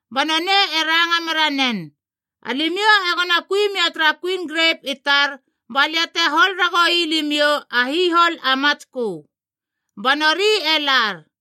Ba nonei e ranga mera nen, ‘Alimiou egona kui mia tara kuin grep i tar balia te hol ragoui limiou a hihol a matskö.’ Ba nori e lar.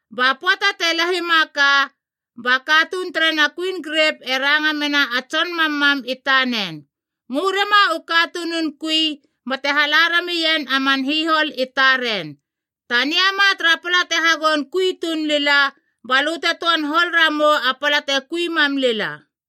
“Ba pöata te lahima ka, ba katuun terena kuin grep e ranga mena a tson mammam i tanen. ‘Ngö rema u katunun kui bate hala ramien a man hihol i taren, taniama tara pala te hagoun kui tuun lila, balö te töan hol ramou a pala te kui mam lila.’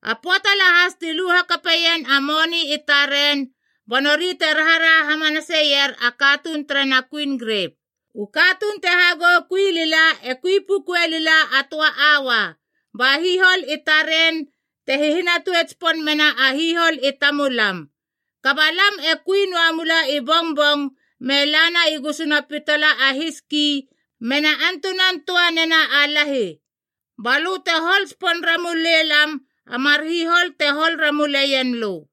A pöata lahas ti lu hakapeien a moni i taren, ba nori te raharaha hamanaseier a katuun terena kuin grep, ‘U katuun te hagou kui lila e kui pukue lila a töa aua, ba hihol i taren te hihinatue tsipon mena a hihol i tamulam. Kaba lam e kui noa mula i bongbong me lana i gusuna pitala a hiski mena antunan töa nena a lahi, balö te hol tsipon ramule lam a mar hol te hol ramuleien lö!’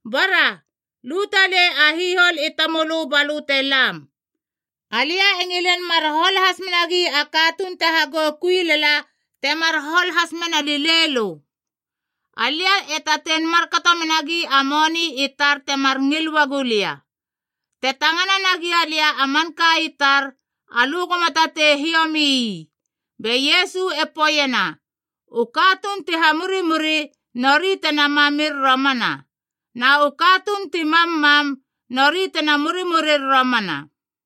Bara, lu talei a hihol i tamölö ba lö te lam. Alia e ngilin mar hol has menagi a katuun te hagou kui lala temar hol has mena lilei lö. Alia e tatein markato menagi a moni i tar temar ngil uagu lia. Te tangana nagia lia a manka i tar, alö goma tatei hiomi ii.’” Be Iesu e poeiena, “U katuun ti hamurimuri nori tena mamir romana, na u katuun ti mammam nori tena murimurir romana.”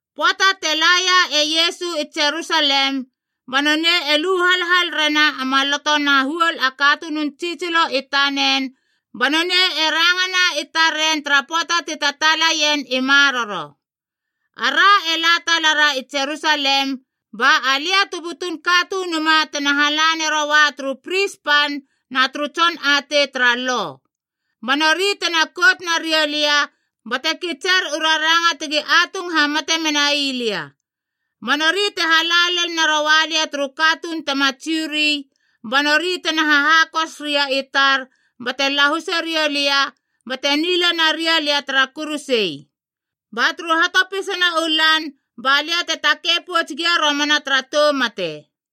Pöata te laia e Iesu i Jerusalem, ba nonei e lu halhal rena a maloto na huol a katunun tsitsilo i tanen, ba nonei e rangana i taren tara pöata ti tataalaien i maroro. “Ara e la talara i Jerusalem, ba Alia tu butun Katunuma tena hala neroa turu pris pan na turu tson atei tara Lo. Ba nori tena kout nariou lia bate kitser u raranga tegi atung hamate menai lia. Ba nori te hala lel naroa lia turu katuun tema Jiu ri, ba nori tena hahakos ria i tar bate lahuse riou lia, bate nila naria lia tara kuruse. Ba turu hatopisana u lan balia te takei pouts gia romana tara tou mate.”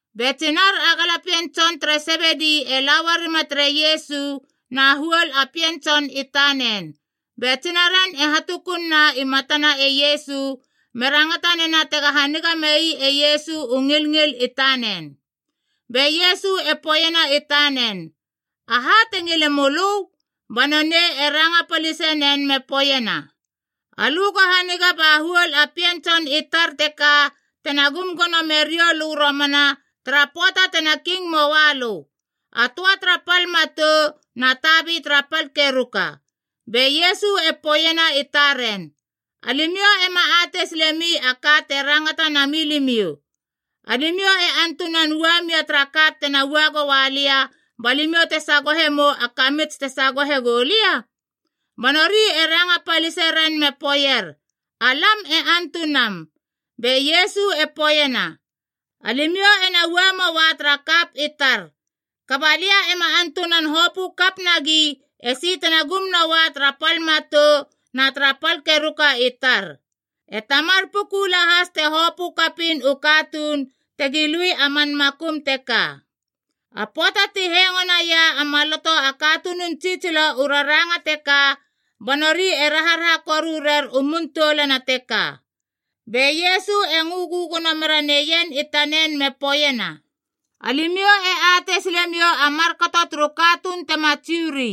Be tsinar a galapien tson tere Sebedi e la uarima tere Iesu na huol a pien tson i tanen, be tsinaren e hatukunna i matana e Iesu, me rangata nena tega haniga mei e Iesu u ngilngil i tanen. Be Iesu e poeiena i tanen, “Aha te ngile mölö?” Ba nonei e ranga palisenen me poeiena, “Alö go haniga ba huol a pien tson i tar teka tena gum gono meriou lö romana tara pöata tena king möalö, a töa tara pal matou na tabi tara pal keruka.” Be Iesu e poeiena i taren, “Alimiou ema atei silemi a ka te rangata nami limiou. Alimiou e antunan ua mia tara kap tena ua goa lia ba limiou tena sagohe mou a kamits tena sagohe gou lia?” Ba nori ranga palise ren me poeier, “Alam e antunam.” Be Iesu e poeiena, “Alimiou ena ua moa tara kap i tar. Kaba lia ema antunan hopö kap nagi esi tena gum noa tara pal matou na tara pal keruka i tar. E Tamar puku lahas te hopö kapiin u katuun tegi lui a man makum teka.” A pöata ti hengo naia a maloto a katunun tsitsilo u raranga teka, ba nori e raharaha koru rer u mun toulana teka. Be Iesu e ngö gögono mera neien i tanen me poeiena, “Alimiou e atei silemiou a markato turu katuun tema Jiu ri.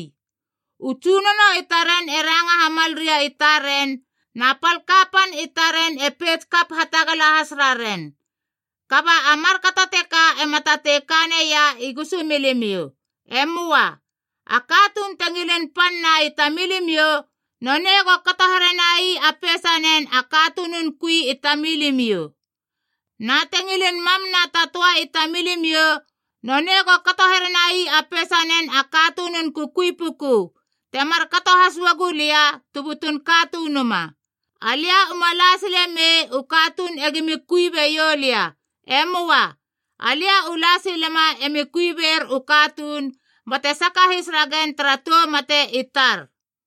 U tsunono i taren e ranga hamal ria i taren, na pal kapan i taren e peits kap hatagala has raren. Kaba a markato teka ema tatei ka neia i gusumilimiou. E möa. A katuun te ngilin panna i tamilimiou, nonei go kato herenai a peisanen a katunun kui i tamilimiou. Na te ngilin mamna ta töa i tamilimiou, nonei go kato herenai a peisanen a katunun kukui puku, te markato has uagu Lia tu butun Katunuma. Alia uma la sile mei u katuun egimi kui beiou lia. E möa. Alia u la silema emi kui ber u katuun, bate sakahis ragen tara tou mate i tar.”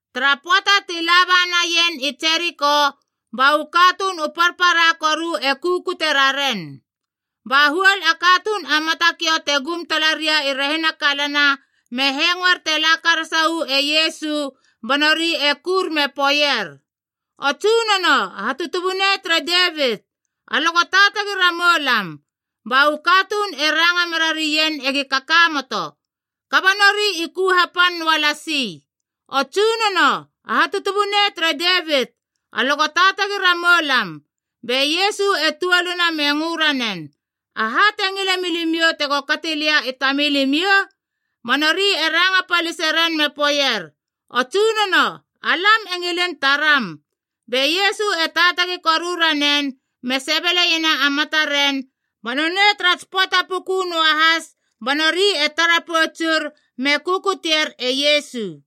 Tara pöata ti laba naien i Jeriko, ba u katuun u parpara koru e kukute raren. Ba huol a katuun a matakiou te gum talaria i rehina kalana me hengoer te la karasa uu e Iesu ba nori e kur me poeier, “O Tsunono a Hatutubunei tere Devit! Alö go taatagi ramou lam!” Ba u katuun e ranga merarien egi kakamoto. Kaba nori i ku hapan noalasi, “O Tsunono a Hatutubunei tere Devit! Alö go taatagi ramou lam!” Be Iesu e tuoluna me ngö ranen, “Aha te ngile milimiou tego kati lia i tamilimiou?” Ba nori i ranga paliseren me poeier, “O Tsunono, alam e ngilin taram!” Be Iesu e taatagi koru ranen me sebele iena a mataren, ba nonei tara tsi pöata puku noahas ba nori e tara poutsur, me kukutier e Iesu.